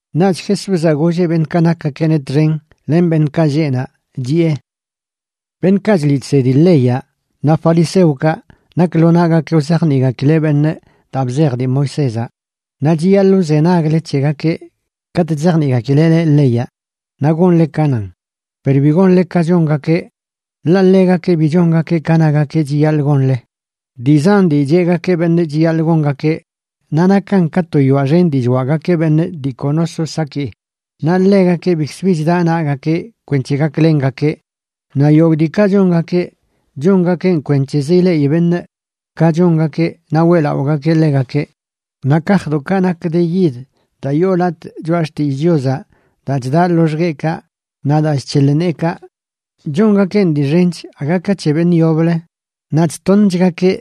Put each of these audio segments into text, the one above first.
Naꞌch Jesúzaꞌ golleꞌ beṉꞌkaꞌ nakgakeꞌneꞌ txen len beṉꞌkaꞌ lleꞌ naꞌ, chiꞌe: ―Beṉꞌkaꞌ chliꞌ chsedi leyaꞌ naꞌ fariseokaꞌ nak lo naꞌgakeꞌ wzajniꞌgakileꞌ beṉꞌ daa bzej dii Moisézaꞌ. Naꞌ chiyaḻꞌ wzenagle c̱hegakeꞌ katꞌ chzajniꞌgakileꞌ leꞌ leyaꞌ naꞌ gonle ka nan. Per bi gonle ka chongakeꞌ, ḻaꞌ ḻegakeꞌ bi chongakeꞌ ka nagakeꞌ chiyaḻꞌ gonle. Dii zan dii cheꞌgakeꞌ beṉꞌ chiyaḻꞌ gongakeꞌ, naꞌ nakan ka to yoaꞌ xen dii chwaꞌgakeꞌ beṉꞌ dii kono so saki, naꞌ ḻegakeꞌ bikz bi chda naꞌgakeꞌ kwenc̱he gaklengakeꞌ. Naꞌ yogꞌ diikaꞌ chongakeꞌ chongakeꞌn kwenc̱hezə ileꞌi beṉꞌ ka chongakeꞌ naꞌ weꞌlaꞌogakeꞌ ḻegakeꞌ. Naꞌ kajdoꞌkaꞌ nak de yid daa yoo latꞌ Choꞌa Xtillꞌ Chiozaꞌ daa chdaꞌ loxgueꞌkaꞌ naꞌ daa chc̱heḻ neekaꞌ chongakeꞌn dii xench aga ka c̱he beṉꞌ yoblə, naꞌ chtoṉchgakeꞌ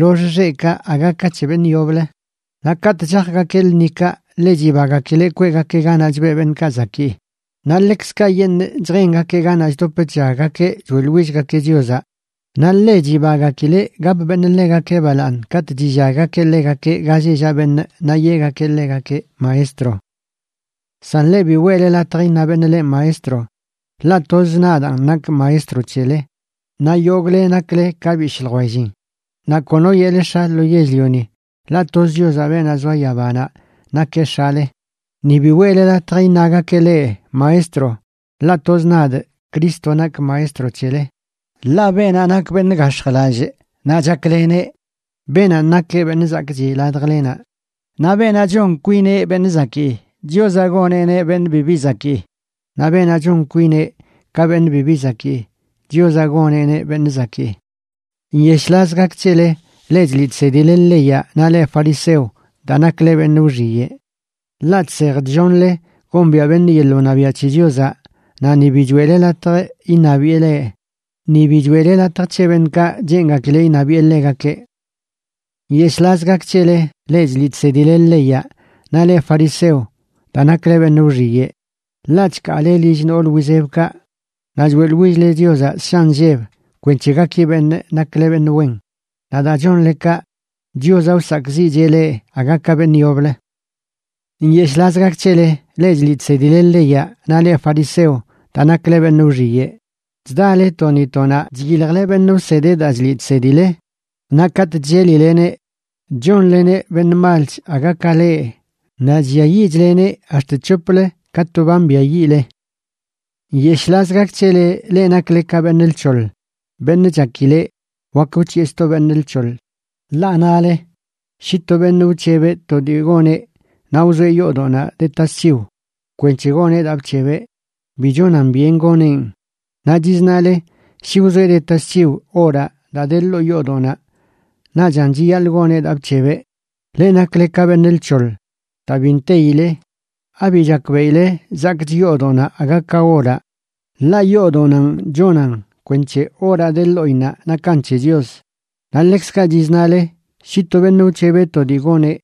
lox xeꞌkaꞌ aga ka c̱he beṉꞌ yoblə. Naꞌ katꞌ chajgakeꞌ lṉikaꞌ, ḻe chibagakileꞌ kweꞌgakeꞌ ganaꞌ chbeꞌ beṉꞌkaꞌ zakii, naꞌ ḻekzkaꞌyeṉꞌ chjengakeꞌ ganaꞌ chdop chllaggakeꞌ choeꞌḻwillgakeꞌ Chiozaꞌ. Naꞌ ḻe chibagakileꞌ gap beṉꞌ ḻegakeꞌ balaaṉ katꞌ chillaggakeꞌ ḻegakeꞌ ga lleꞌ llaꞌ beṉꞌ naꞌ yeꞌgakeꞌ ḻegakeꞌ: “maestro”. ’San leꞌ, bi weꞌle latj iṉa beṉꞌ leꞌ “maestro”, ḻaꞌ toz nadaan nakꞌ Maestro c̱hele naꞌ yogꞌle nakle ka bishꞌ ljwellin. Naꞌ kono yeꞌle “x̱a” lo yell-lioni, ḻaꞌ toz Chiozaꞌ, beenaꞌ zoa yabanaꞌ, nakeꞌ X̱ale. Ni bi weꞌle latj iṉagakeꞌ leꞌ “maestro”, ḻaꞌ toz nadꞌ, Cristo, nakꞌ Maestro c̱hele. Ḻaꞌ beenaꞌ nak beṉꞌ gax̱jlallꞌ naꞌ chakleneꞌ, beenanꞌ nakeꞌ beṉꞌ zakꞌchi ladjlenaꞌ. Naꞌ beenaꞌ chon kwineꞌ beṉꞌ zakii, Chiozaꞌ goneꞌneꞌ beṉꞌ bibi zakii. Naꞌ beenaꞌ chon kwineꞌ ka beṉꞌ bibi zakii, Chiozaꞌ goneꞌneꞌ beṉꞌ zakii. ’¡Nyeshꞌlaz gak c̱hele, leꞌ chliꞌ chsedileꞌ leyaꞌ naꞌ leꞌ fariseo, daa nakle beṉꞌ wxiyeꞌ! Ḻaꞌ chsej chllonle gombiaꞌ beṉꞌ yeḻꞌ wṉabiaꞌ c̱he Chiozaꞌ, naꞌ ni bi choeꞌle latj iṉabiꞌe leꞌ, ni bi choeꞌle latj c̱he beṉꞌkaꞌ cheengakileꞌ iṉabiꞌe ḻegakeꞌ. ’¡Nyeshꞌlaz gak c̱hele, leꞌ chliꞌ chsedileꞌ leyaꞌ naꞌ leꞌ fariseo, daa nakle beṉꞌ wxiyeꞌ! Ḻaꞌ chkaale lill nool wizebkaꞌ naꞌ choeꞌḻwill-le Chiozaꞌ ssha nlleb kwenc̱he gaki beṉꞌ nakle beṉꞌ wen. Naꞌ daa chonle kaꞌ, Chiozaꞌ wsakꞌziꞌcheꞌ leꞌ aga ka beṉꞌ yoblə. ’¡Nyeshꞌlaz gak c̱hele, leꞌ chliꞌ chsedileꞌ leyaꞌ naꞌ leꞌ fariseo, daa nakle beṉꞌ wxiyeꞌ! Chdale to ni to naꞌ chyiljle beṉꞌ wsedeꞌ daa chliꞌ chsedile. Naꞌ katꞌ chllelileneꞌ chónleneꞌ beṉꞌ malch aga ka leꞌ naꞌ chlliayiꞌchleneꞌ ax̱t c̱hoplə ka to ba mbiayiꞌle. ’¡Nyeshꞌlaz gak c̱hele, leꞌ nakle ka beṉꞌ lc̱hoḻ, beṉꞌ chakileꞌ wak wc̱hiꞌe sto beṉꞌ lc̱hoḻ! Ḻaꞌ nale: “Shi to beṉꞌ wc̱hebeꞌ to dii goneꞌ naꞌ wzoeꞌ yoodoꞌnaꞌ de tasc̱hiw kwenc̱he goneꞌ daa bc̱hebeꞌ, bi chonan byen goneꞌn.” Naꞌ chiznale: “Shi wzoeꞌ de tasc̱hiw oraꞌ daa de ḻoo yoodoꞌnaꞌ, naꞌchan chiyaḻꞌ goneꞌ daa bc̱hebeꞌ.” ¡Leꞌ nakle ka beṉꞌ lc̱hoḻ daa bi nteyile! ¿Abi chakbeꞌile zakꞌch yoodoꞌnaꞌ aga ka oraꞌ? Ḻaꞌ yoodoꞌnanꞌ chonan kwenc̱he oraꞌ de ḻoꞌinnaꞌ nakan c̱he Chios. Naꞌ ḻekzkaꞌ chiznale: “Shi to beṉꞌ wc̱hebeꞌ to dii goneꞌ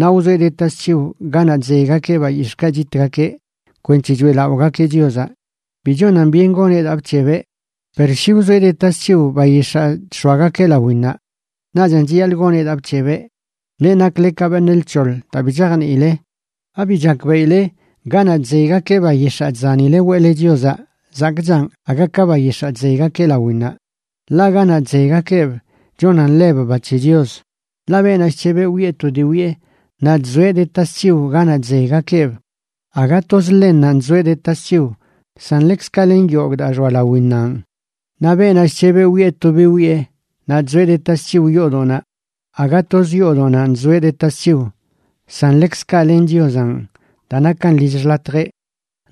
naꞌ wzoeꞌ de tasc̱hiw ganaꞌ chzeygakeꞌ bayix̱ꞌkaꞌ chitgakeꞌ kwenc̱he choeꞌlaꞌogakeꞌ Chiozaꞌ, bi chonan byen goneꞌ daa bc̱hebeꞌ. Per shi wzoeꞌ de tasc̱hiw bayix̱aa chx̱oagakeꞌ lawinnaꞌ, naꞌchan chiyaḻꞌ goneꞌ daa bc̱hebeꞌ.” ¡Leꞌ nakle ka beṉꞌ lc̱hoḻ daa bi chajniile! ¿Abi chakbeꞌileꞌ ganaꞌ chzeygakeꞌ bayix̱aa chzanile weꞌle Chiozaꞌ zakꞌchan aga ka bayix̱aa chzeygakeꞌ lawinnaꞌ?, ḻaꞌ ganaꞌ chzeygakeꞌb chonan ḻeb ba c̱he Chios. Ḻaꞌ beenaꞌ chc̱heb wiꞌe to dii wiꞌe naꞌ chzoeꞌ de tasc̱hiw ganaꞌ chzeygakeꞌb, aga toz ḻennanꞌ chzoeꞌ de tasc̱hiw, san ḻekzkaꞌ len yogꞌ daa xoa lawinnanꞌ. Naꞌ beenaꞌ chc̱heb wiꞌe to dii wiꞌe naꞌ chzoeꞌ de tasc̱hiw yoodoꞌnaꞌ, aga toz yoodoꞌnanꞌ chzoeꞌ de tasc̱hiw, san ḻekzkaꞌ len Chiozanꞌ daa nakan lill xḻatjeꞌ.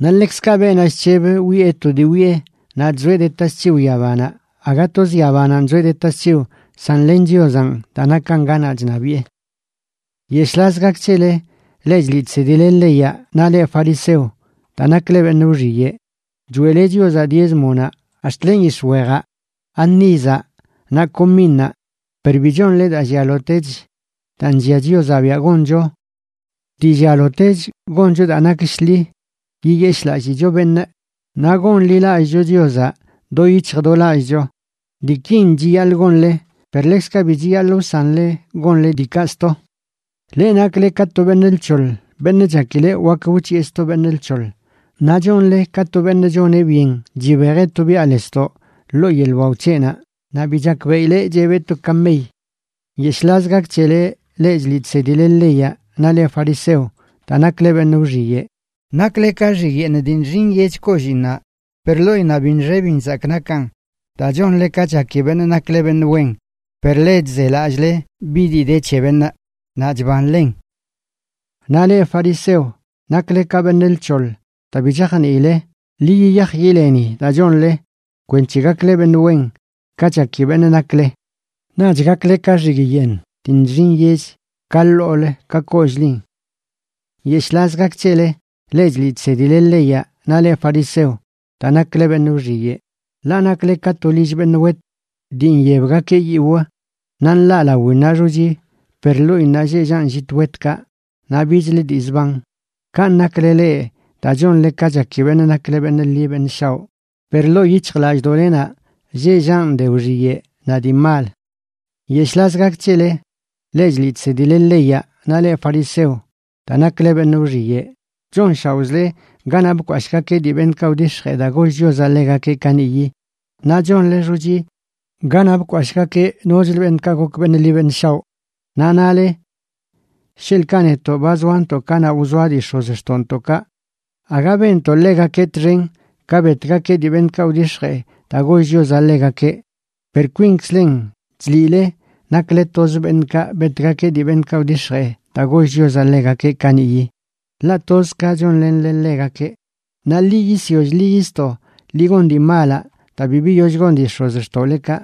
Naꞌ ḻekzkaꞌ beenaꞌ chc̱heb wiꞌe to dii wiꞌe naꞌ chzoeꞌ de tasc̱hiw yabanaꞌ, aga toz yabananꞌ chzoeꞌ de tasc̱hiw, san len Chiozanꞌ daa nakan ganaꞌ chṉabiꞌe. ’¡Nyeshꞌlaz gak c̱hele, leꞌ chliꞌ chsedile leyaꞌ naꞌ leꞌ fariseo, daa nakle beṉꞌ wxiyeꞌ! Choeꞌle Chiozaꞌ diézmonaꞌ ax̱t len yix̱wejaꞌ, anízaꞌ, naꞌ cominnaꞌ, per bi chonle daa llialotech daa nllia Chiozaꞌ biaꞌ goncho. Dii llialotech goncho daa nak shḻi, yiyeshꞌlallicho beṉꞌ, naꞌ gonḻilallꞌcho Chiozaꞌ do yic̱hj do lallꞌcho. Diikin chiyaḻꞌ gonle, per ḻekzkaꞌ bi chiyaḻꞌ wsanle gonle diikaꞌ sto. ¡Leꞌ nakle ka to beṉꞌ lc̱hoḻ beṉꞌ chakileꞌ wak wc̱hiꞌe sto beṉꞌ lc̱hoḻ! Naꞌ chonle ka to beṉꞌ choneꞌ byen chibejeꞌ to biꞌa lesdoꞌ ḻoo yeḻꞌ wao c̱heꞌnaꞌ naꞌ bi chakbeꞌileꞌ chebeꞌ to kamey. ’¡Nyeshꞌlaz gak c̱hele, leꞌ chliꞌ chsedile leyaꞌ naꞌ leꞌ fariseo, daa nakle beṉꞌ wxiyeꞌ! Nakle ka xigꞌ yeeṉ dii nxi nyech kolliinnaꞌ per ḻoꞌinnaꞌ bi nxe bi nzakꞌ nakan, daa chonle ka chaki beṉꞌ nakle beṉꞌ wen per ḻe chzelallꞌle bi dii de c̱he beṉꞌ naꞌ chbanlen. Naꞌ leꞌ fariseo, ¡nakle ka beṉꞌ lc̱hoḻ daa bi chajniile! Ḻi yiyaj yileni daa chonle kwenc̱he gakle beṉꞌ wen ka chaki beṉꞌ nakle, naꞌch gakle ka xigꞌ yeeṉ dii nxi nyech ka ḻoolə ka kollꞌlin. ’¡Nyeshꞌlaz gak c̱hele, leꞌ chliꞌ chsedile leyaꞌ naꞌ leꞌ fariseo, daa nakle beṉꞌ wxiyeꞌ! Ḻaꞌ nakle ka to lill beṉꞌ wet dii nyebgakeꞌ yiwꞌ naꞌ nḻaꞌ lawinnaꞌ xochi, per ḻoꞌinnaꞌ lleꞌ llaꞌn llit wetkaꞌ naꞌ bichlə dii zban. Kanꞌ nakle leꞌ daa chonle ka chaki beṉꞌ nakle beṉꞌ ḻi beṉꞌ shaoꞌ per ḻoo yic̱hjlallꞌdoꞌlenaꞌ lleꞌ llaꞌn de wxiyeꞌ naꞌ dii mal. ’¡Nyeshꞌlaz gak c̱hele, leꞌ chliꞌ chsedile leyaꞌ naꞌ leꞌ fariseo, daa nakle beṉꞌ wxiyeꞌ! Chonshaoꞌzle ganaꞌ bkwashꞌgakeꞌ dii beṉꞌkaꞌ wdix̱jee daa goll Chiozaꞌ ḻegakeꞌ kaniꞌyi, naꞌ chonle xochi ganaꞌ bkwashꞌgakeꞌ nochlə beṉꞌkaꞌ gok beṉꞌ ḻi beṉꞌ shaoꞌ. Naꞌ nale: “Sheḻꞌkaꞌ netoꞌ ba zoantoꞌ kanaꞌ wzoa dii x̱ozxtoꞌntoꞌkaꞌ aga benntoꞌ ḻegakeꞌ txen ka betgakeꞌ dii beṉꞌkaꞌ wdix̱jee daa goll Chiozaꞌ ḻegakeꞌ.” Per kwinzkzlen chliꞌle nakle toz beṉꞌkaꞌ betgakeꞌ dii beṉꞌkaꞌ wdix̱jee daa goll Chiozaꞌ ḻegakeꞌ kaniꞌyi, ḻaꞌ toz ka chonlenle ḻegakeꞌ. ¡Naꞌ ḻi yisyoll ḻi yisto ḻi gon dii malaꞌ daa bi biyoll gon dii x̱ozxtoꞌlekaꞌ!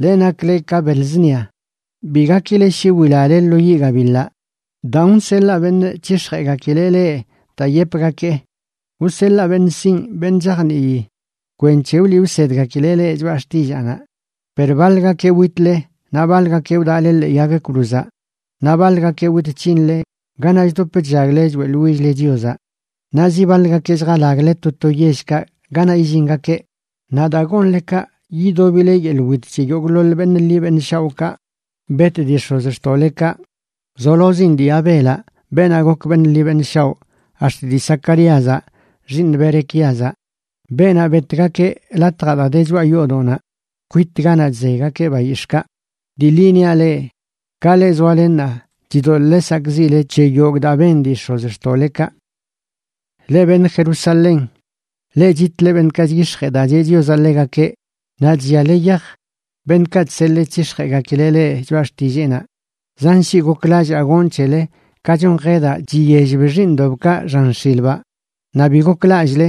’¡Leꞌ nakle ka beḻ zṉia! Bi gakile shi wilale lo yiꞌ gabiḻaꞌ. Daan wseḻaa beṉꞌ c̱hix̱jeꞌgakileꞌ leꞌ daa yepgakee. Wseḻaa beṉꞌ sinꞌ beṉꞌ chajnii kwenc̱he wliꞌ wsedgakileꞌ leꞌ choꞌa xtillaanaꞌ. Per baḻgakeꞌ witle, naꞌ baḻgakeꞌ wdaꞌle ḻee yag cruzaꞌ, naꞌ baḻgakeꞌ wit c̱hinle ganaꞌ chdop chllagle choeꞌḻwill-le Chiozaꞌ, naꞌ zi baḻgakeꞌ lljalagle to to yellkaꞌ ganaꞌ illingakeꞌ. Naꞌ daa gonle kaꞌ, yidobile yeḻꞌ wit c̱he yogꞌḻoḻ beṉꞌ ḻi beṉꞌ shaoꞌkaꞌ bet dii x̱ozxtoꞌlekaꞌ, wzolozin dii Abelaꞌ beenaꞌ gok beṉꞌ ḻi beṉꞌ shaoꞌ, ax̱t dii Zacaríazaꞌ, xiiṉ Berequíazaꞌ, beenaꞌ betgakeꞌ latjaꞌ daa de choꞌa yoodoꞌnaꞌ, kwit ganaꞌ chzeygakeꞌ bayix̱ꞌkaꞌ. Dii ḻi niaꞌ leꞌ, ka leꞌ zoale ṉaa chidoḻꞌle sakꞌziꞌle c̱he yogꞌ daa ben dii x̱ozxtoꞌlekaꞌ. ’¡Leꞌ beṉꞌ Jerusalén, leꞌ chitle beṉꞌkaꞌ chyix̱jee daa cheꞌ Chiozaꞌ ḻegakeꞌ, naꞌ chlliale yaj beṉꞌkaꞌ chseḻee c̱hix̱jeꞌgakileꞌ leꞌ choꞌa xtilleenaꞌ! ¡Zan shii goklallaa gonꞌ c̱hele ka chon jedaꞌ chiyellb xiiṉdoꞌbkaꞌ xan x̱ilbaꞌ, naꞌ bi goklallꞌle!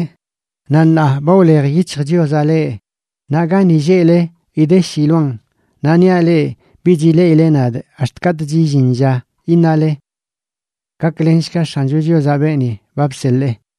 Naꞌ ṉaa ba wlej yic̱hj Chiozaꞌ leꞌ, naꞌ gani lleꞌle idesh iloan. Naꞌ niaꞌ leꞌ, bich ileꞌile nadꞌ ax̱t katꞌch illin lla iṉale: “¡Gaklenshga X̱ancho Chiozaꞌ beeni ba bseḻee!”